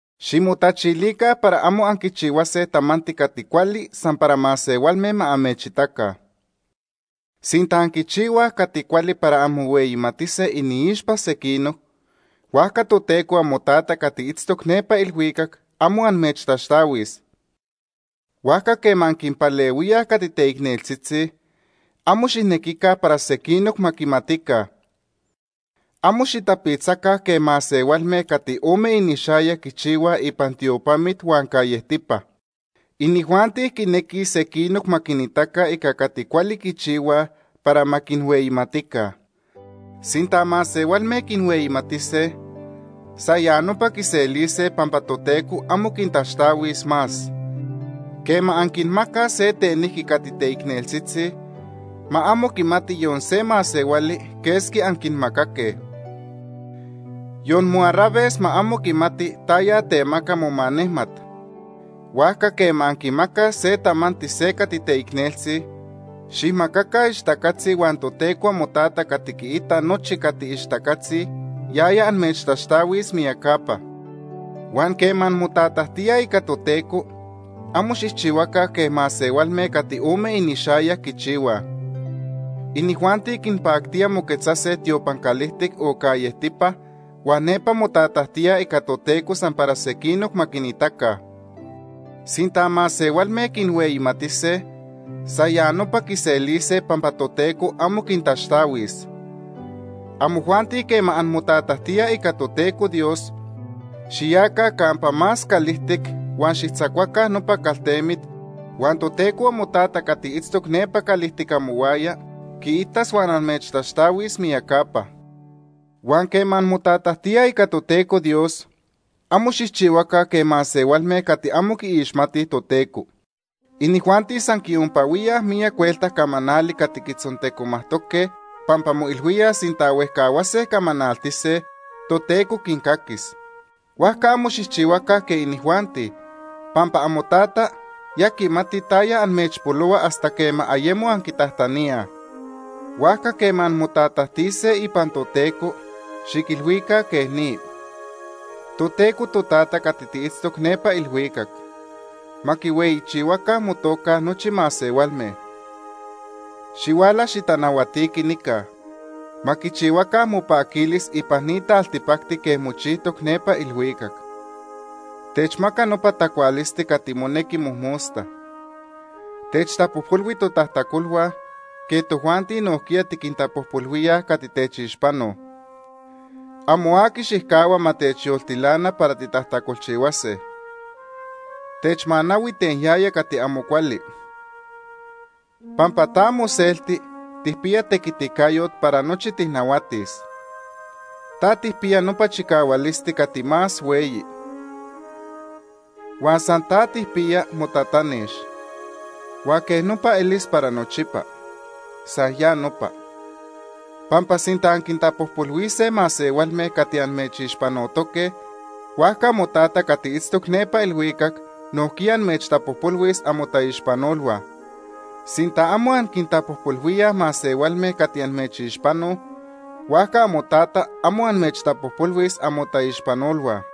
“Ximotachilica para amo anquichihuase tamanti cati cuali san para masehualme ma amechitaca. Sinta anquichihuaj cati cuali para anmohueyimatise iniixpa sequinoc, huajca Toteco amoTata cati itztoc nepa ilhuicac amo amechtaxtahuis. Huajca quema anquinpalehuíaj cati teicneltzitzi, amo xijnequica para sequinoc ma quimatica. Amo xitapitzaca quej masehualme cati ome inixayac quichihuaj ipan tiopamit huan callejtipa. Inijuanti quinequij sequinoc ma quinitaca ica cati cuali quichihuaj para ma quinhueyimatica. Sinta masehualme quinhueyimatise, san ya nopa quiselise pampa Toteco amo quintaxtahuis más. Quema anquinmacaj se tenijqui cati teicneltzitzi, ma amo quimati yon se masehuali quesqui anquinmacaque. Yon moarraves ma amo quimati taya temaca momanejmat. Huajca quema anquimacaj se tamanti se cati teicneltzi, xijmacaca ixtacatzi, huan Toteco amoTata cati quiita nochi cati ixtacatzi, yaya amechtaxtahuis miyacapa. “Huan quema anmotatajtíaj ica Toteco, amo xijchihuaca quej masehualme cati ome inixayac quichihuaj. Inijuanti quinpactía moquetzase tiopan calijtic o callejtipa huan nepa motatajtíaj ica Toteco san para sequinoc ma quinitaca. Sinta masehualme quinhueyimatise, san ya nopa quiselise pampa Toteco amo quintaxtahuis. Amojuanti quema anmotatajtíaj ica Toteco Dios, xiyaca campa más calijtic huan xijtzacuaca nopa caltemit huan Toteco amoTata cati itztoc nepa calijtic amohuaya quiitas huan amechtaxtahuis miyacapa. “Huan quema anmotatajtíaj ica Toteco Dios, amo xijchihuaca quej masehualme cati amo quiixmatij Toteco. Inijuanti san quiompahuíaj miyac huelta camanali cati quitzontecomajtoque pampa moilhuíaj sinta huejcahuase camanaltise, Toteco quincaquis. Huajca amo xijchihuaca quej inijuanti, pampa amoTata ya quimati taya amechpolohua hasta quema ayemo anquitajtaníaj. Huajca quema anmotatajtise ipan Toteco, xiquilhuica quej ni: ‘Toteco Totata cati tiitztoc nepa ilhuicac. Ma quihueyichihuaca motoca O ma mitzhueyichihuaca. nochi masehualme. Xihuala, xitanahuatiqui nica. Ma quichihuaca mopaquilis ipan ni taltipacti quej mochijtoc nepa ilhuicac. Techmaca nopa tacualisti cati monequi mojmosta. Techtapojpolhui totajtacolhua, quej tojuanti nojquiya tiquintapojpolhuíaj cati techixpanoj. Amo aqui xijcahua ma techyoltilana para titajtacolchihuase. Techmanahui ten yaya cati amo cuali. Pampa ta moselti tijpiya tequiticayot para nochi tijnahuatis. Ta tijpiya nopa chicahualisti cati más hueyi. Huan san ta tijpiya motatanex. Huan quej nopa elis para nochipa. San ya nopa.’ “Pampa sinta anquintapojpolhuise masehualme cati amechixpanotoque, huajca amoTata cati itztoc nepa ilhuicac nojquiya amechtapojpolhuis amotaixpanolhua. Sinta amo anquintapojpolhuíaj masehualme cati amechixpanoj, huajca amoTata amo amechtapojpolhuis amotaixpanolhua.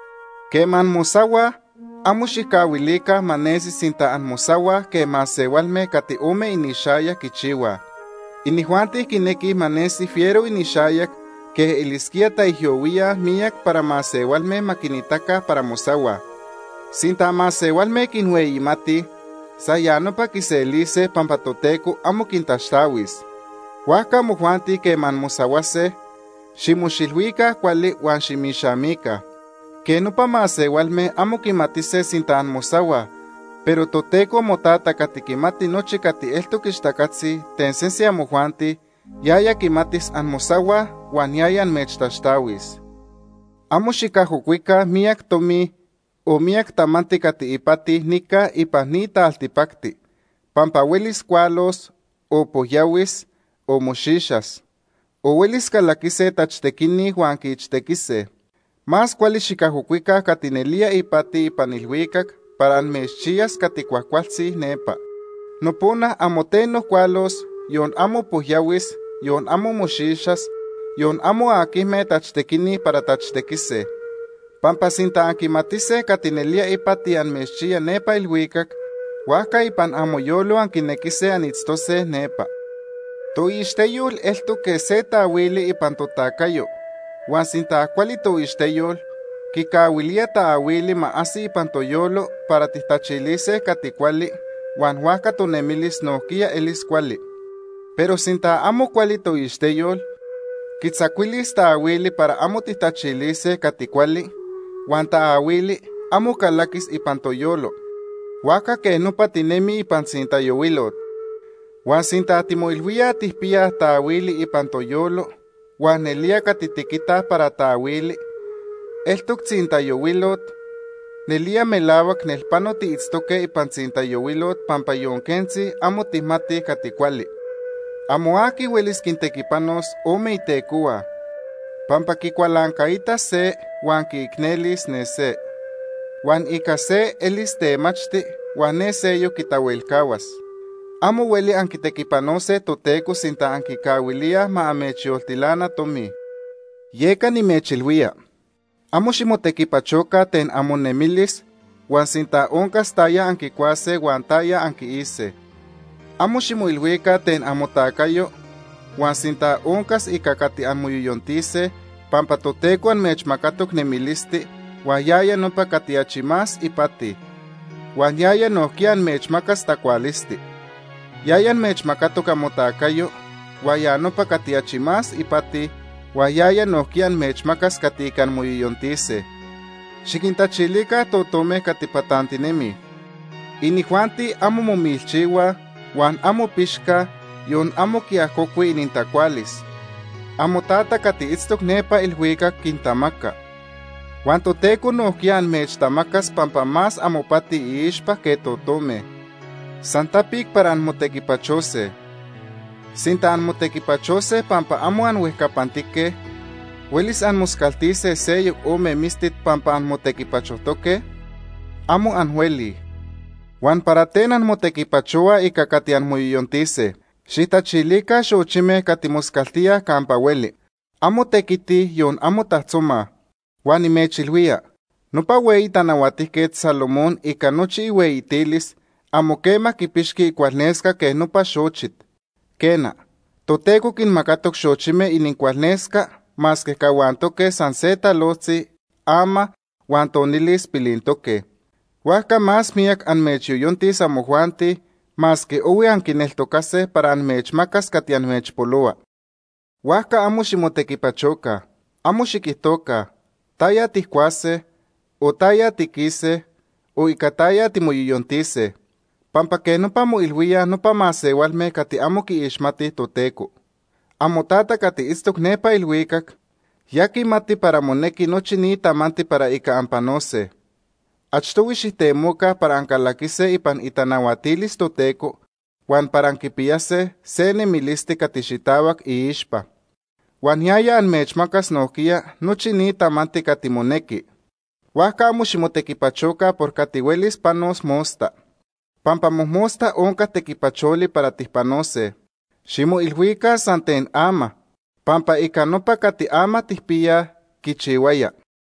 “Quema anmosahuaj, amo xijcahuilica ma nesi sinta anmosahuaj quej masehualme cati ome inixayac quichihuaj. Inijuanti quinequij ma nesi fiero inixayac quej taijyohuíaj miyac para masehualme ma quinitaca para mosahuaj. Sinta masehualme quinhueyimatij, san ya nopa quiselise pampa Toteco amo quintaxtahuis. Huajca amojuanti quema anmosahuase, ximoxilhuica cuali huan ximixamica. Quej nopa masehualme amo quimatise sinta anmosahuaj, pero Toteco amoTata cati quimati nochi cati eltoc ixtacatzi ten sese amojuanti, yaya quimatis anmosahuaj, huan yaya amechtaxtahuis. “Amo xicajocuica miyac tomi, o miyac tamanti cati ipati nica ipan ni taltipacti pampa huelis cualos, o pojyahuis, o moxixas. O huelis calaquise tachtequini huan quiichtequise. Más cuali xicajocuica cati nelía ipati ipan ilhuicac para amechchiyas cati cuajcualtzi nepa. Nopona amo teno cualos, yon amo pojyahuis, yon amo moxixas, yon amo aquijme tachtequini para tachtequise. Pampa sinta anquimatise cati nelía ipati amechchiya nepa ilhuicac, huajca ipan amoyolo anquinequise anitztose nepa. “Toixteyol eltoc quej se taahuili ipan totacayo huan sinta cuali toixteyol, quicahuilía taahuili ma ajsi ipan toyolo para tijtachilise cati cuali, huan huajca tonemilis nojquiya elis cuali. Pero sinta amo cuali toixteyol, quitzacuilis taahuili para amo tijtachilise cati cuali huan taahuili amo calaquis ipan toyolo, huajca quej nopa tinemij ipan tzintayohuilot. Huan sinta timoilhuíaj tijpiyaj taahuili ipan toyolo huan nelía cati tiquitaj para taahuili, eltoc tzintayohuilot, nelía melahuac nelpano tiitztoque ipan tzintayohuilot pampa yon quentzi amo tijmatij cati cuali. “Amo aqui huelis quintequipanos ome itecohua, pampa quicualancaitas se huan quiicnelis ne se. Huan ica se elis temachti, huan ne seyoc quitahuelcahuas. Amo hueli anquitequipanose Toteco sinta anquicahuilíaj ma amechyoltilana tomi. “Yeca nimechilhuía, amo ximotequipachoca ten amonemilis huan sinta oncas taya anquicuase huan taya anquiise. Amo ximoilhuica ten amotacayo huan sinta oncas ica cati anmoyoyontise, pampa Toteco amechmacatoc nemilisti, huan ya nopa cati achi más ipati; huan yaya nojquiya amechmacas tacualisti. Yaya amechmacatoc amotacayo, huan ya nopa cati achi más ipati, huan yaya nojquiya amechmacas cati ica anmoyoyontise. Xiquintachilica totome cati patantinemij. Inijuanti amo momilchihuaj, huan amo pixcaj, yon amo quiajocuij inintacualis. AmoTata cati itztoc nepa ilhuicac quintamaca. Huan Toteco nojquiya amechtamacas pampa más amopati iixpa que totome. San tapic para anmotequipachose. Sinta anmotequipachose pampa amo anhuejcapantique, ¿huelis anmoscaltise seyoc ome mistit pampa anmotequipachojtoque? Amo anhuelij. “Huan ¿para ten anmotequipachohuaj ica cati anmoyoyontise? Xijtachilica xochime cati moscaltíaj campa hueli. Amo tequitij, yon amo tajtzomaj. Huan nimechilhuía, nopa hueyi Tanahuatijquet Salomón ica nochi ihueyitilis amo quema quipixqui icualnesca quej nopa xochit. Quena, Toteco quinmacatoc xochime inincualnesca masque cahuantoque san se talojtzi ama huan tonilis pilintoque. Huajca más miyac amechyoyontis amojuanti, masque ohui anquineltocase para amechmacas cati amechpolohua. Huajca amo ximotequipachoca. Amo xiquijtoca: ‘¿Taya tijcuase? o ¿taya tiquise? o ¿ica taya timoyoyontise?’ Pampa quej nopa moilhuíaj nopa masehualme cati amo quiixmatij Toteco. AmoTata cati itztoc nepa ilhuicac, ya quimati para monequi nochi ni tamanti para ica anpanose. Achtohui xijtemoca para ancalaquise ipan itanahuatilis Toteco huan para anquipiyase se nemilisti cati xitahuac iixpa. Huan yaya amechmacas nojquiya nochi ni tamanti cati monequi. Huajca amo ximotequipachoca por cati huelis panos mosta. Pampa mojmosta onca tequipacholi para tijpanose. Ximoilhuica san ten ama pampa ica nopa cati ama tijpiyaj quichihuaya.